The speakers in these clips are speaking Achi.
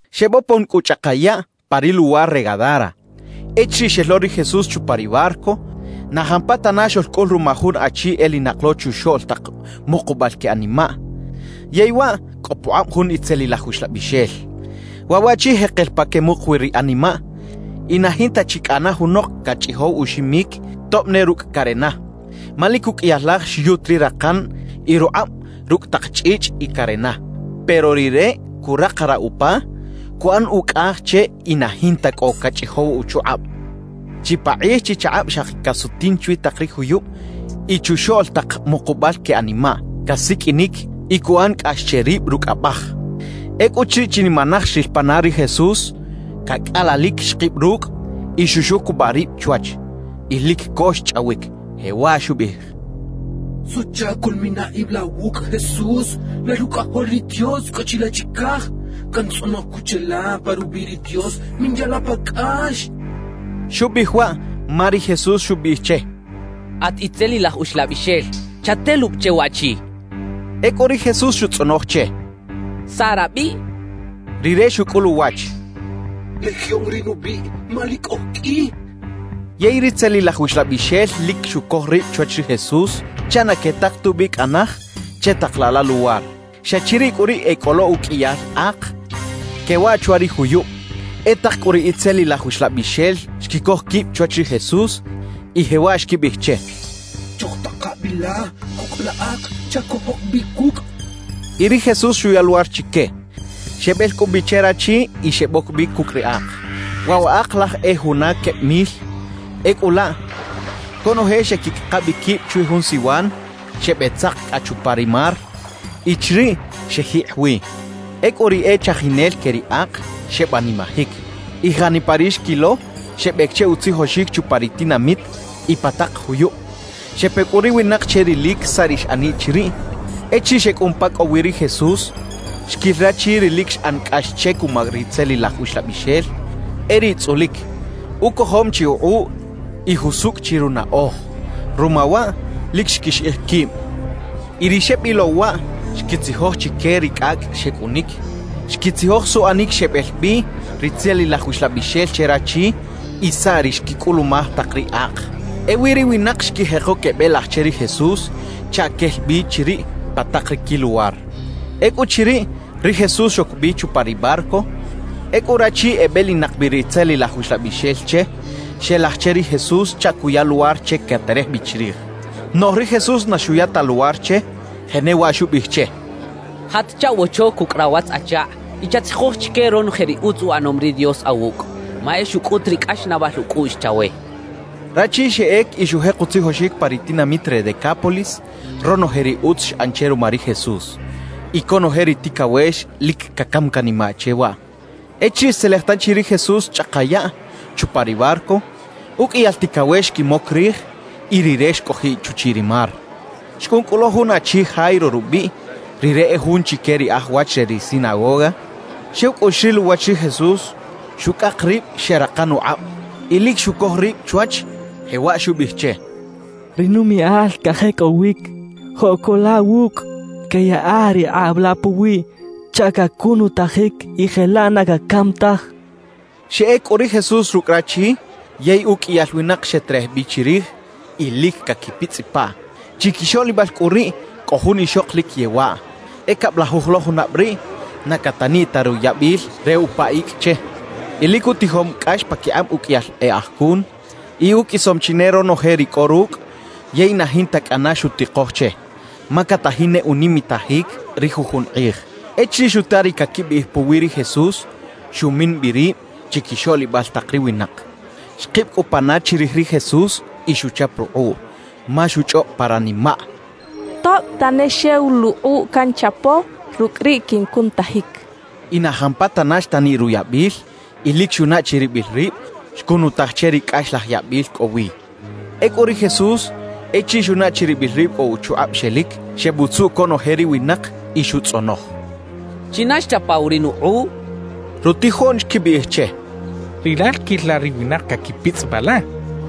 Xebopon cꞌu chꞌaka yaꞌ pa ri luwar re Gadara. Echiriꞌ xel lo ri Jesús chupa ri barco, na jampatana xoꞌlcꞌul ruma jun achi elinak lo chuxoꞌl tak mukubal que animaꞌ, yey waꞌ cꞌo pukꞌab jun itzelilaj uxlabixel. Waꞌ waꞌchi jekel pa quemuk wi ri animaꞌ y na jinta chi cꞌana junok cachꞌijow uximic, tob ne rucꞌ carena. Ma lic uqꞌuiyal laj xyut ri rakan y rukꞌab rucꞌ tak chꞌichꞌ y carena; pero rire curakaraꞌ upa, cuꞌan ucꞌaj che y na jinta cꞌo cachꞌijow uchukꞌab. Chipakꞌij chichakꞌab xaki casutin chwi tak ri juyub y chuxoꞌl tak mukubal que animaꞌ, casiqꞌuinic y cuꞌan cꞌax che rib rucꞌ abaj. Ecꞌuchiriꞌ chinimanaj xril pana ri Jesús, cacꞌalalic xkib rucꞌ y xuxucubaꞌ rib chwach. Y lic co xchꞌawic, jewaꞌ xubiꞌij: —¿Suꞌchac coꞌlmina ib la wucꞌ, Jesús lal Ucꞌajol ri Dios cꞌo chilaꞌ chicaj? Cantzꞌonoj cꞌu cheꞌla pa rubiꞌ ri Dios, minya la pa cꞌax —xchaꞌ. Xubiꞌij waꞌ ma ri Jesús xubiꞌij che: «At itzelilaj uxlabixel, chatelubi che waꞌchi» xchaꞌ. Ecꞌu ri Jesús xutzꞌonoj che: —¿Saꞌ rabiꞌ? —xcha che. Rire xucꞌul uwach: —Legión ri nubiꞌ, ma lic oj qꞌui —xchaꞌ. Yey ritzelilaj uxlabixel lic xucoj rib chwach ri Jesús chaꞌ na quetak tubi cꞌa naj che tak laꞌ la luwar. Xa chiriꞌ cꞌu riꞌ e cꞌo lo uqꞌuiyal ak quewaꞌ chwa ri juyub. E tak cꞌu ri itzelilaj uxlabixel xquicoj quib chwach ri Jesús y jewaꞌ xquibiꞌij che: —Chojtaka bi la cucꞌ la ak chaꞌ cojoc bi cucꞌ —xechaꞌ. Y ri Jesús xuya luwar chique. Xebel cꞌu bi che rachi y xeboc bi cucꞌ ri ak. Waꞌ wa ak laj e juna queb mil. Ecꞌu laꞌ conoje xeꞌquicꞌaka bi quib chwi jun siwan, xebeꞌtzak cꞌa chupa ri mar y chiriꞌ xejikꞌ wi. Ecꞌu ri e chajinel que ri ak, xebanimajic. Y janipa ri xquilo xebec che utzijoxic chupa ri tinamit y pa tak juyub. Xepe cꞌu ri winak che rilic saꞌ ri xꞌaniꞌ chiriꞌ. Echiriꞌ xecꞌun pa cꞌo wi ri Jesús, xquil rachi ri lic xꞌan cꞌax che cuma ritzelilaj uxlabixel; e riꞌ tzꞌulic, ucojom chi ukꞌuꞌ y jusucꞌ chi runaꞌoj. Ruma waꞌ, lic xquixiꞌij quib. Y ri xebilow waꞌ xquitzijoj chique ri cꞌacꞌ xecꞌunic; xquitzijoj suꞌanic xebel bi ritzelilaj uxlabixel che rachi y saꞌ ri xquicꞌulumaj tak ri ak. Ewi ri winak xquijeko quebelaj che ri Jesús chaꞌ quel bi chiriꞌ pa tak ri quiluwar. Ecꞌuchiriꞌ, ri Jesús xoc bi chupa ri barco. Ecꞌu rachi ebelinak bi ritzelilaj uxlabixel che, xelaj che ri Jesús chaꞌ cuya luwar che caterej bi chirij. Noꞌj ri Jesús na xuya ta luwar che, jenewaꞌ xubiꞌij che: —Jat chaꞌwocho cucꞌ rawatz-achakꞌ y chatzijoj chique ronoje ri utz uꞌanom ri Dios awucꞌ, ma e xucꞌut ri cꞌaxnaꞌbal ucꞌuꞌx chawe —xcha che. Rachi xeꞌec y xujek utzijoxic pa ri tinamit re Decápolis ronoje ri utz xꞌan che ruma ri Jesús, y conoje ri ticawex lic cacam canimaꞌ che waꞌ. Echiriꞌ xtzelej tanchi ri Jesús chꞌaka yaꞌ chupa ri barco, uqꞌuiyal ticawex xquimoc rij y Rire xcꞌojiꞌ chuchiꞌ ri mar. Xcꞌun cꞌu lo jun achi Jairo rubiꞌ, rire e jun chique ri e aj wach re ri sinagoga. Xew cꞌu xril uwach ri Jesús, xucꞌak rib xeꞌrakan ukꞌab. Y lic xucoj rib chwach, jewaꞌ xubiꞌij che: —Ri numiꞌal cajecꞌowic. Joꞌ co la wucꞌ, queꞌyaꞌa ri kꞌab la puwiꞌ chaꞌ cacunutajic y jelaꞌ na cacam taj —xchaꞌ. Xeꞌec cꞌu ri Jesús rucꞌ rachi, yey uqꞌuiyal winak xeterej bi chirij y lic caquipitzꞌipaꞌ. Chiquixoꞌlibal cꞌu riꞌ cꞌo jun ixok lic yewaꞌ, e cablajuj lo junab riꞌ na cataniꞌ ta ruyabil re upa icꞌ che. Y lic utijom cꞌax paquikꞌab uqꞌuiyal e aj cun, y uqꞌuisom chi ne ronoje ri cꞌo rucꞌ; yey na jinta cꞌana xutikoj che, ma catajin ne unimitajic ri jujun kꞌij. Echiriꞌ xuta ri caquibiꞌij puwi ri Jesús, xumin bi rib chiquixoꞌlibal tak ri winak. Xkib cꞌu pana chirij ri Jesús y xuchap rukꞌuꞌ, ma xuchꞌob pa ranimaꞌ: «Tob tane xew luꞌkꞌuꞌ canchapo, rucꞌ riꞌ quincunutajic.» Y na jampatana xtaniꞌ ruyabil y lic xunaꞌ chiribil rib xcunutaj che ri cꞌaxlaj yabil cꞌo wi. Ecꞌu ri Jesús echiriꞌ xunaꞌ chiribil rib cꞌo uchukꞌab xelic, xebutzuꞌ conoje ri winak y xutzꞌonoj: —¿China xchapaw ri nukꞌuꞌ? —xchaꞌ. Rutijoꞌn xquibiꞌij che: —Rilal quil la ri winak caquipitzꞌipaꞌ la.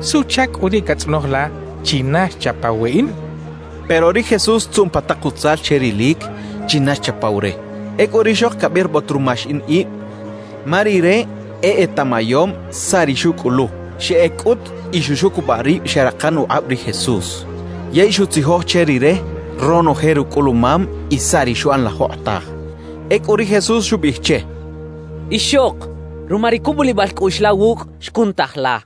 ¿Suꞌchac cꞌu riꞌ catzꞌonoj la: “China xchapaw weꞌin”? —xecha che. Pero ri Jesús xtzuꞌn pa tak utzal che rilic china xchapaw re. Ecꞌu rixok cabirbot ruma xiꞌin ib, ma rire e etaꞌmayom saꞌ ri xucꞌulu. Xeꞌec cꞌut y xuxucubaꞌ rib xeꞌrakan ukꞌab ri Jesús. Yey xutzijoj che Rire ronoje rucꞌulumam y saꞌ ri xuꞌan la jokꞌotaj. Ecꞌu ri Jesús xubiꞌij che: —Ixok, ruma ri cubulibal cꞌuꞌx la wucꞌ, xcunutaj la.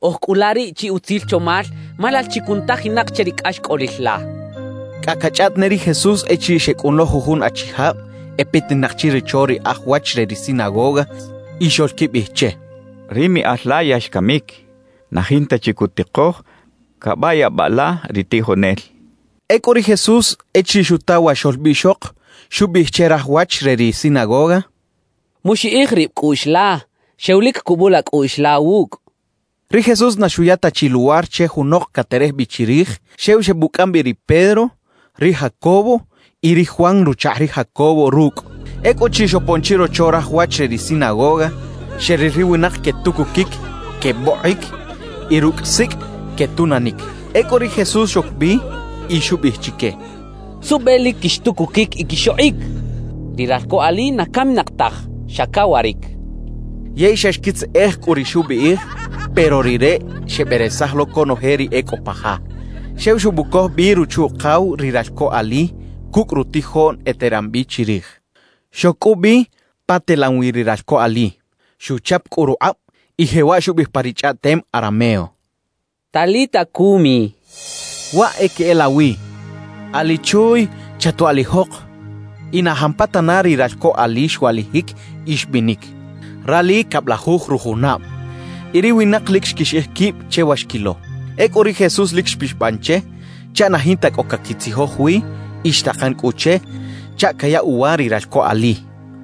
Oj cꞌu la riꞌ chi utzil chomal, ma lal chi cunutajinak che ri cꞌaxcꞌolil la —xchaꞌ. Cꞌa cachꞌaꞌt ne ri Jesús echiriꞌ xecꞌun lo jujun achijab e petinak chirocho ri aj wach re ri sinagoga y xoꞌlquibiꞌij che: —Ri miꞌal la ya xcamic; na jinta chi cutikoj cabayabaꞌ la ri tijonel —xecha che. Ecꞌu ri Jesús, echiriꞌ xuta wa xoꞌlbiꞌxok, xubiꞌij che raj wach re ri sinagoga: —Muxiꞌij rib cꞌuꞌx la, xew lic cubula cꞌuꞌx la wucꞌ —xcha che. Ri Jesús na xuya ta chi luwar che junok caterej bi chirij; xew xebucꞌam bi ri Pedro, ri Jacobo y ri Juan ruchakꞌ ri Jacobo rucꞌ. Ecꞌuchiriꞌ xopon chirocho raj wach re ri sinagoga, xeril ri winak quetucuquic, quebokꞌic y rucꞌ sicꞌ quetunanic. Ecꞌu ri Jesús xoc bi y xubiꞌij chique: —¿Suꞌbe lic quixtucuquic y quixokꞌic? Ri ralco ali na caminak taj, xa cawaric —xcha chique. Yey xa xquitzeꞌej cꞌu ri xubiꞌij. Pero Rire xeberesaj lo conoje ri e cꞌo pa ja, xew xebucoj bi ruchu-ukaw ri ralco ali cucꞌ rutijoꞌn eteran bi chirij. Xoc cꞌu bi pa telan wi ri ralco ali. Xuchap cꞌu rukꞌab y jewaꞌ xubiꞌij pa ri chꞌaꞌtem arameo: —¡Talita cumi! —xcha che. (Waꞌ e queꞌelawi: “Ali chuuy, ¡Chatwaꞌlijok!”) Y na jampatana ri ralco ali xwaꞌlijic y xbinic. (Rali cablajuj rujunab.) Y ri winak lic xquixiꞌij quib che wa xquilo. Ecꞌu ri Jesús lic xpixaban che chaꞌ na jinta cꞌo caquitzijoj wi y xtakan cꞌu che chaꞌ cayaꞌ uwa ri ralco ali.